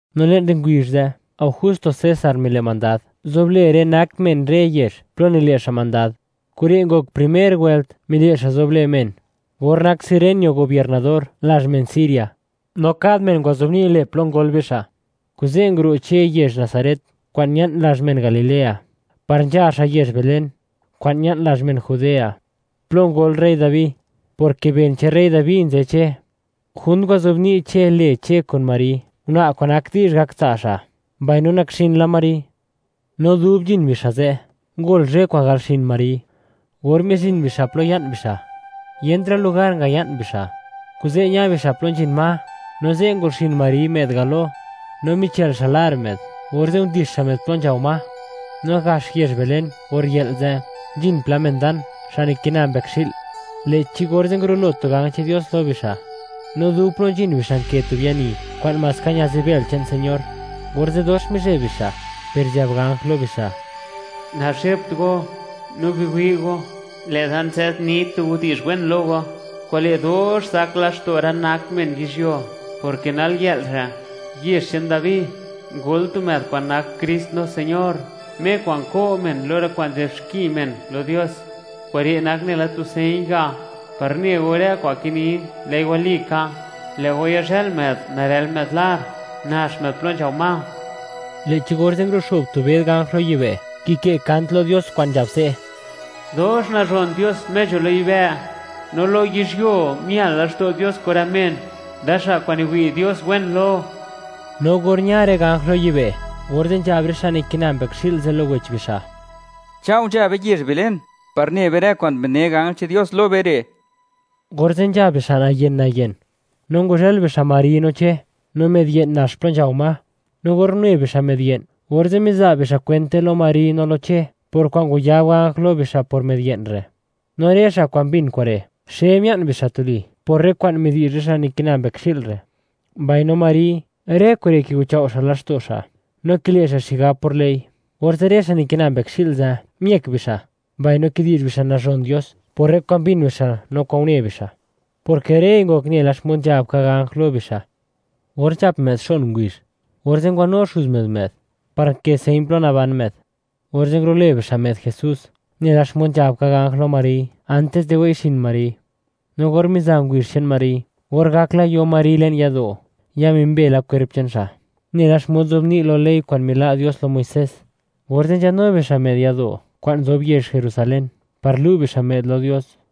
No le'n rë ngubizh ze', Augusto César mile' mandad, zoblë rë nak men rë yezh plo nile' xa' mandad. Kure' ngok primer wëlt mile' xa' zoblë men, or nak Cirenio gobiernador lazh men Siria. No kad men ngwazobni' lë plo ngol bixa'. Kuze' nguro' Che yezh Nazaret kwa'n ña'n lazh men Galilea, par nzha xa' yezh Belén, kwa'n ña'n lazh men Judea, plo ngol rey Dabi, porke ben che'n rey Dabi nzë Che. Junt ngwazobni' Che lë Che kun Mari, una' kwa'n nak di'zh gak tsa' xa', mbaino nakxin la Mari. No dub nzhin bixa' ze', ngol zhë kwa'n gal xin Mari. Or mizhin bixa' plo ya'n bixa', yentra' lugar ngaya'n bixa', kuze' ña bixa' plo nzhin ma, no ze' ngol xin Mari, më'd galo, no michël xa' lar më'd, orze' ndix xa' më'd plo nzhao ma. No gax yezh Belén, or yë'l ze', nzhin pla men dan, xa' nikina mbëkxi'l. Lë'chi orze' ngurulo tu ganj che'n Dios lo bixa', no dub plo nzhin bixa' nkë tu biani kwa'n maska ña'zbël che'n Señor, orze' dox mizheb bixa', per nzhab ganj lo bixa': ―Nazhebt go, no biwi' go, lë'da nzadni tu widi'zh wen lo go kwa'n le' dox zak laxto' rë nak men yizhyuo, porke nalyë'l re', yezh che'n Dabi, ngol tu më'd kwa'n nak Krist no Señor, Me kwa'n ko' men lo rë kwa'n nzë'b xki men lo Dios. Kure' nak nela tu señ ga', par ne go rë kwa'n kinin, lë'i walika; lë' go yazhël më'd, narël më'd lar, nax më'd plo nzhao ma. Lë'chi orze', nguruxo'b tu bëd ganj lo yibë', kikë' kant lo Dios kwa'n nzhab se': ¡Dox nazhon Dios, Me nzho lo yibë', no lo yizhyuo, mial laxto' Dios kun rë men, rë xa' kwa'n niwi' Dios wen lo! No or ña rë ganj lo yibë', orze' nzhab rë xa' niki'na mbëkxi'l ze' lo wech bixa': ―Chao' nzha be yezh Belén, par ne be rë kwa'n bi'dne ganj che'n Dios lo be re'. Orze' nzha bixa' nayen-nayen, no ngwazhël bixa' Mari no Che, no më'd ye'n nax plo nzhao ma. No or une bixa' më'd ye'n, orze' miza' bixa' kwente lo Mari no lo Che, por kwa'n ngwayab ganj lo bixa' por më'd ye'n re'. No rë xa' kwa'n mbin kure', xe mia'n bixa' tuli, por rë kwa'n midi'zh rë xa' nikina mbëkxi'l re'. Mbaino Mari, rë kure' kiguchao' xa' laxto' xa', no kile' xa' xigab por lë'i. Orze' rë xa' nikina mbëkxi'l ze', miëk bixa', mbaino kidi'zh bixa' nazhon Dios por rë kwa'n mbin bixa' no kwa'n une bixa', porke rëi ngok nela xmod nzhab ka ganj lo bixa'. Or nzhap më'd xon ngubizh, orze' ngwanu xuz më'd, më'd, par nkë señ plo naban më'd; orze' ngulo'lë bixa' më'd JESÚS, nela xmod nzhab ka ganj lo Mari, antis di wei'xin Mari. No or miza ngubizh che'n Mari, or gak la yo Mari le'n yado', ya mimbe la kwerp che'n xa', nela xmod nzobni' lo ley kwa'n mila' Dios lo Muisés, orze' nzhanu bixa' më'd yado' kwa'n nzob yezh Jerusalén, par lu' bixa' më'd lo Dios.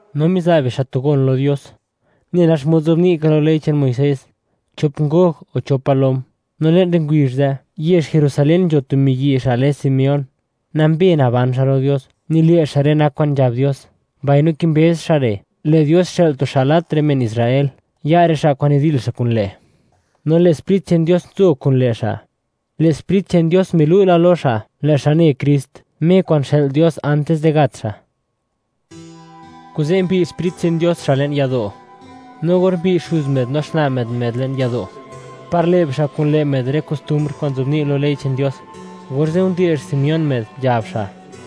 No miza' bixa' tu gon lo Dios, nela xmod nzobni' ka lo ley che'n Muisés; chop ngog o chop palom. No le'n rë ngubizh ze', yezh Jerusalén nzho tu miyi' xa' lë Simeón. Nambe naban xa' lo Dios, nile' xa' rë nak kwa'n nzhab Dios, mbaino kimbëz xa' re', lë' Dios xë'l tu xa' lat rë men Israel, ya' rë xa' kwa'n nidil xa' kun lë'. No Lë' Sprit che'n Dios nzo kun lë' xa'. Lë' Sprit che'n Dios milu' la lo xa', lë' xa' ne Krist, Me kwa'n xë'l Dios antis di gat xa'. Kuze' mbiy' Sprit che'n Dios xa' le'n yado'. No or mbiy' xuz më'd no xna' më'd, më'd le'n yado', par le' bixa' kun lë' më'd rë kostumbr kwa'n nzobni' lo ley che'n Dios, orze' nde'x Simeón më'd, nzhab xa':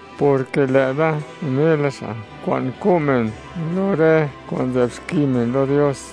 porke lë'da unela xa' kwa'n ko' men lo rë kwa'n nzë'b xki men lo Dios,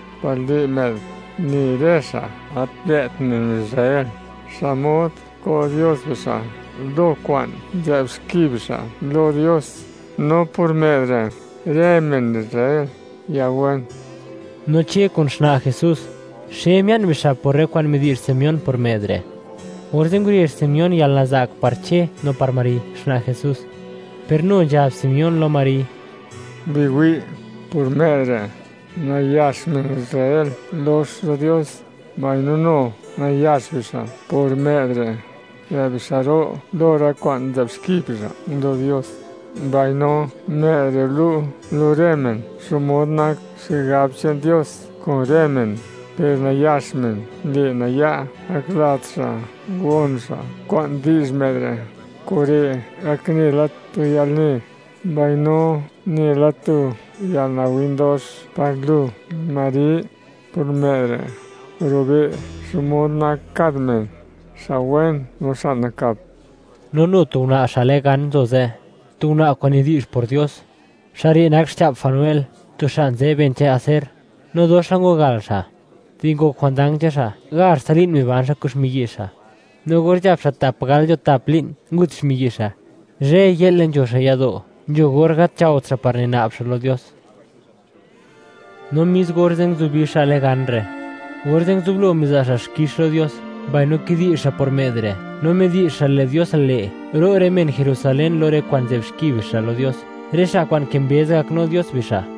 par le' më'd, ne rë xa' gat lë't men Israel, xmod ko' Dios bixa' lo kwa'n nzë'b xki bixa' lo Dios. No por më'd re', rë men Israel ya wen. No Che kun xna' Jesús, xe mia'n bixa' por rë kwa'n midi'zh Simeón por më'd re'. Orze' ngurezh Simeón yalnaza'k par Che no par Mari xna' Jesús, per nu nzhab Simeón lo Mari: ―Biwi', por më'd re', nayax men Israel lox lo Dios, mbaino nu nayax bixa' por më'd re', lë' bixa' ro' lo rë kwa'n nzë'b xki bixa' lo Dios; mbaino më'd re' lu' lo rë men xmod nak xigab che'n Dios kun rë men, per nayax men le' naya', gaklat xa' gon xa' kwa'n di'zh më'd re'. Kure' gak nela tu yalne, mbaino nela tu yalnawin dox par lu, Mari. Por më'd re', rube' xmod nak kad men, xa' wen no xa' nakap. No nu tu una' xa' lë Gan nzo ze'; tu una' kwa'n nidi'zh por Dios. Xa' re' nak xcha'p Fanuel, tu xa' nzë ben che'n Aser. No dox la ngwagal xa'. Di ngok jwandang che'n xa', gazhtsa li'n miban xa' kun xmiyi' xa', no or nzhap xa' tap gal nzho tap li'n, ngut xmiyi' xa'. Zhëy-yë'le nzho xa' yado'. Nzho or gat nzhaot xa' par nina'b xa' lo Dios. No mis orze', nguzubi xa' lë Gan re', orze' nguzublo miza' xa' xkix lo Dios, mbaino kidi'zh xa' por më'd re', no midi'zh xa', lë' Dios le', ro' rë men Jerusalén lo rë kwa'n nzë'b xki bixa' lo Dios, rë xa' kwa'n kimbëz gaknu Dios bixa'.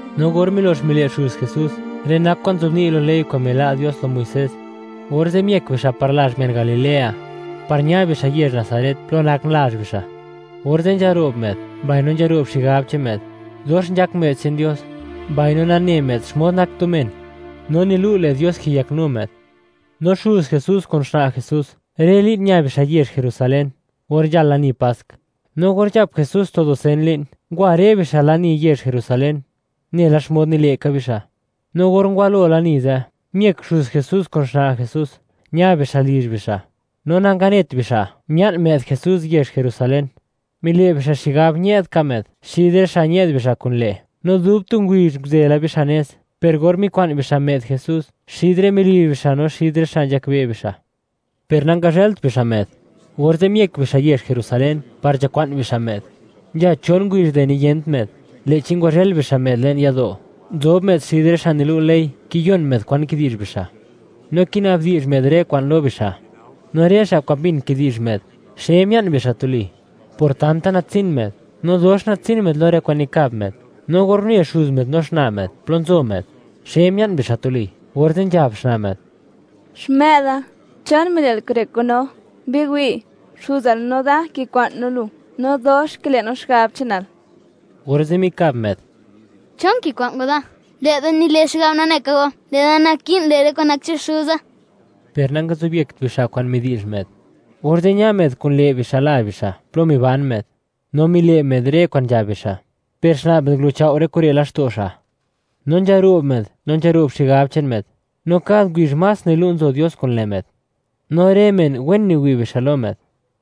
No or milox mile' xuz Jesús, rë nak kwa'n nzobni' lo ley kwa'n mila' Dios lo Muisés, orze' miëk bixa' par lazh men Galilea, par ña bixa' yezh Nazaret, plo nak lazh bixa'. Orze' nzharo'b më'd, mbaino nzharo'b xigab che'n më'd; dox nzhak më'd che'n Dios mbaino nane më'd xmod nak tu men; no nilu', lë' Dios kiyaknu më'd. No xuz Jesús kun xna' Jesús, rë li'n ña bixa' yezh Jerusalén, or nzhal lani Pask. No or nzhap Jesús tu dusen li'n, ngwa rë bixa' lani yezh Jerusalén, nela xmod nile' ka bixa'. No or ngwalo lani ze', miëk xuz Jesús kun xna' Jesús, ña bixa' lizh bixa', no nanganet bixa', mia'n më'd yezh Jerusalén. Mile' bixa' xigab, ñë'd ka më'd xid rë xa' ñë'd bixa' kun lë', no dub tu ngubizh nguzë la bixa' nez, per or mikwa'n bixa' Jesús xid rë melizh bixa' no xid rë xa' nzhakbe' bixa', per nangazhëlt bixa' më'd. Orze' miëk bixa' yezh Jerusalén par nzhakwa'n bixa' më'd. Nzha chon ngubizh di niyent më'd, lë'chi ngwazhël bixa' më'd le'n yado'; nzob më'd xid rë xa' nilu' ley, kiyon më'd kwa'n kidi'zh bixa', no kinabdi'zh më'd rë kwa'n lo bixa'. No rë xa' kwa'n mbin kidi'zh më'd, xe mia'n bixa' tuli, por tanta natsin më'd, no dox natsin më'd lo rë kwa'n nikab më'd. No or une xuz më'd no xna' më'd plo nzo më'd; xe mia'n bixa' tuli; orze' nzhab xna' më'd: ―Xmë'da, ¿chon mile'l kure' kun no? ¡Biwi', xuzal no da kikwa'n no lu, no dox kile' no xigab che'nal! Orze' mikab më'd: ―¿Chon kikwa'n go da? Lë'da nile xigab, nane ka go lë'da naki'n le rë kwa'n nak che'n Xuza. Per nangazobyekt bixa' kwa'n midi'zh më'd. Orze' ña më'd kun lë' bixa' lazh bixa', plo miban më'd, no mile' më'd rë kwa'n nzhab bixa'. Per xna' më'd nguluchao' rë kure' laxto' xa'. No nzharo'b më'd, no nzharo'b xigab che'n më'd, no kad ngubizh más nilu' nzo Dios kun lë' më'd, no rë men, wen niwi' bixa' lo më'd.